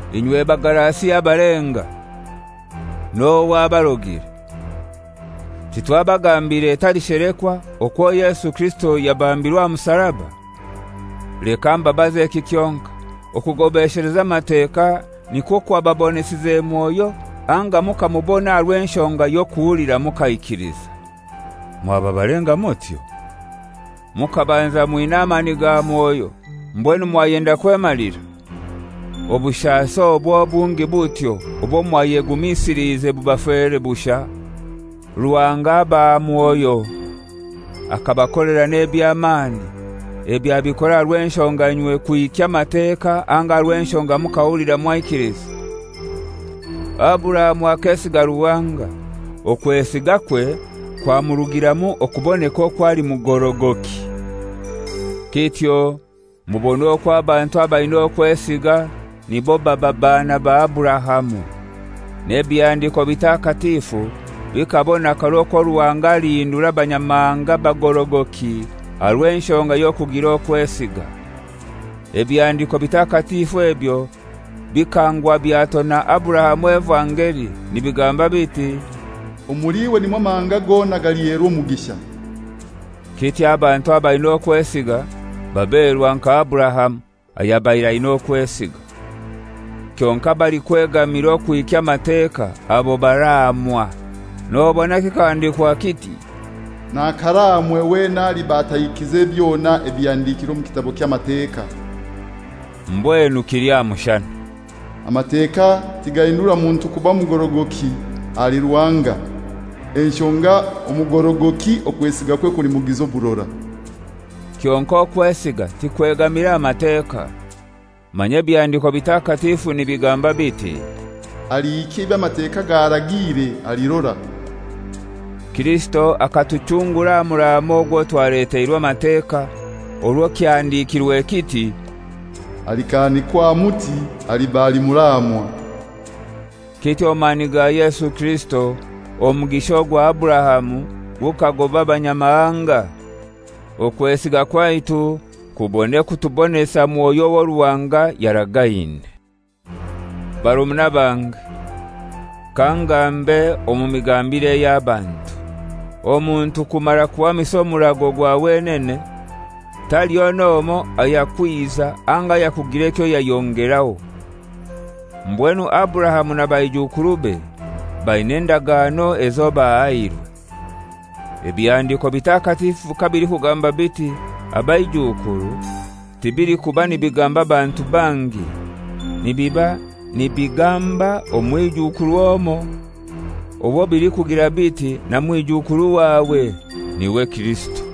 Inywe Bagalasia abalenga! N'ohai abarogire? Titwabagambiire etali shelekwa okwo Yesu Kirisito yabambirwe aha musaraba? Leka mbabaze eki kyonkai: Okugobesheleza Amateka nikwo kwababonesize Mwoyo, anga mukamubona aha rw'enshonga y'okuhulira mukaikiliza? Mwaba balenga mutyo? Mukabanza mwina amani ga Mwoyo, mbwenu mwayenda kwemalira? Obushasi obwo obungi butyo obwo mwayegumisiliize bubafere bushai? Ruhanga abaha Mwoyo, akabakolera n'eby'amani, ebyo abikora aha rw'enshonga inywe kuhikya Amateka anga aha rw'enshonga mukahulira mwaikiliza? Aburahamu akesiga Ruhanga, okwesigakwe kwamurugiramu okuboneka okwo ali mugorogoki. Kityo mubone okwo abantu abaina okwesiga nibo baba baana ba Aburahamu. N'Ebihandiko Bitakatifu bikabona karai okwo Ruhanga alihindura Abanyamahanga babe bagorogoki aha rw'enshonga y'okugira okwesiga. Ebihandiko Bitakatifu ebyo bikanguha byatona Aburahamu evangeli nibigamba biti, «Omuli iwe nimwo amahanga gona galiherwa omugisha.» Kityo abantu abaina okwesiga baberwa nka Aburahamu, ayabaire aina okwesiga. Kyonkai abalikwegamira okuhikya Amateka abo baraamwa; nobona kikahandikwa kiti, «Nakaraamwe wena aliba atahikize byona ebihandikire omu kitabo ky'Amateka.» Mbwenu kili aha mushana, «Amateka tigahindura muntu kuba mugorogoki ahali Ruhanga; enshonga omugorogoki okwesigakwe kulimugiza oburora.» Kyonkai okwesiga tikwegamire aha Mateka, Manya Ebihandiko Bitakatifu nibigamba biti, «Alihikya eby'Amateka garagiire alirora.» Kirisito akatuchungura aha muraamo ogwo twaleteirwe Amateka, orwo kyahandikirwe kiti, «Alikahanikwa aha muti aliba ali muraamwa.» Kityo omu mani ga Yesu Kirisito omugisha ogwa Aburahamu gukagoba Abanyamahanga, okwesiga kwaitu kubone kutubonesa Mwoyo owo Ruhanga yaragaine. Barumuna bange, kangambe omu migambire ey'abantu. Omuntu kumara kuhamisa omurago gwa wenene, taliho n'omoi ayakwiza anga ayakugira ekyo yayongeraho. Mbwenu Aburahamu na baijukurube baina endagano ezo bahairwe. Ebihandiko Bitakatifu kabilikugamba biti, «Abaijukuru» tibilikuba nibigamba bantu bangi; nibiba nibigamba, «Omwijukuru omoi,» owo bilikugira biti, «Na mwijukuru wawe,» niwe Kirisito.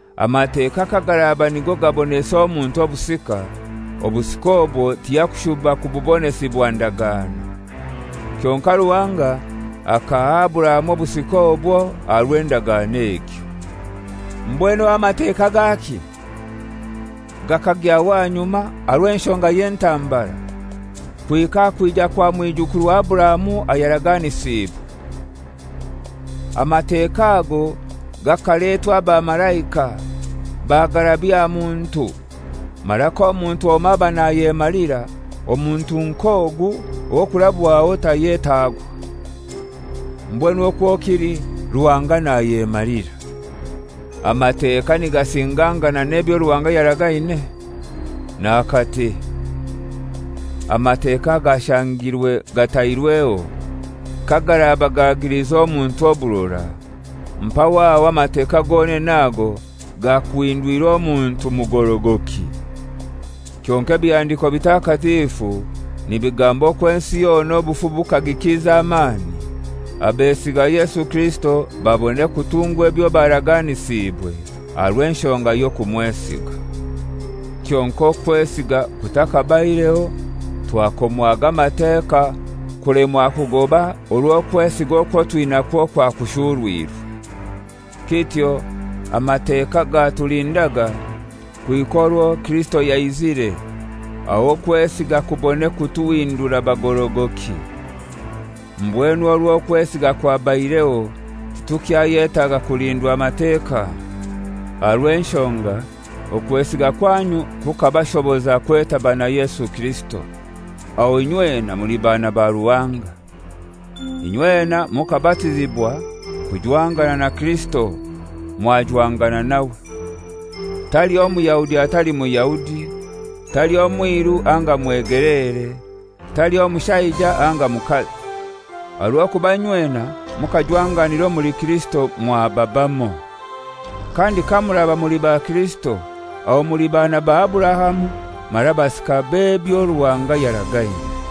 Amateka kagaraba nigo gabonesa omuntu obusika, obusika obwo tiyakushuba kububonesibwa ndagano. Kyonkai Ruhanga akaha Aburahamu obusika obwo aha rw'endagano egyo. Mbwenu aho Amateka gaki? Gakagyaho ahanyuma aha rw'enshonga y'entambara, kuhika aha kwija kwa mwijukuru wa Aburahamu ayaraganisiibwe. Amateka ago gakaletwa abamalaika, bagarabya aha muntu. Mara k'omuntu omoi aba nayemalira, omuntu nk'ogu ow'okurabwaho tayetagwa. Mbwenu okwo kili Ruhanga nayemalira. Amateka nigasingangana n'ebyo Ruhanga yaragaine? N'akati! Amateka agashangirwe gatairweho kagaraba gagilize omuntu oburora, mpaho aho Amateka gonene ago gakuhindwire omuntu kuba mugorogoki. Kyonkai Ebihandiko Bitakatifu nibigamba okwo ensi yona obufu bukagikiza amani, abesiga Yesu Kirisito babone kutungwa ebyo baraganisiibwe aha rw'enshonga y'okumwesiga. Kyonkai okwesiga kutakabaireho, twakomwaga Amateka, kulemwa kugoba orwo okwesiga okwo twinakwo kwakushurwirwe. Kityo Amateka gatulindaga kuhika orwo Kirisito yaizire, aho okwesiga kubone kutuhindura bagorogoki. Mbwenu orwo okwesiga kwabaireho titukyayetaga kulindwa Mateka, aha rw'enshonga okwesiga kwanyu kukabashoboza kwetaba na Yesu Kirisito; aho inywena muli baana ba Ruhanga. Inywena mukabatizibwa kujwangana na Kirisito, mwajwangana nawe. Taliho Muyahudi atali Muyahudi, taliho mwiru anga mwegeleere, taliho mushaija anga mukazi, aha rw'okuba inywena mukajwanganira omuli Kirisito mwaba bamoi. Kandi kamuraba muli ba Kirisito, aho muli baana ba Aburahamu mara basika b'ebyo Ruhanga yaragaine.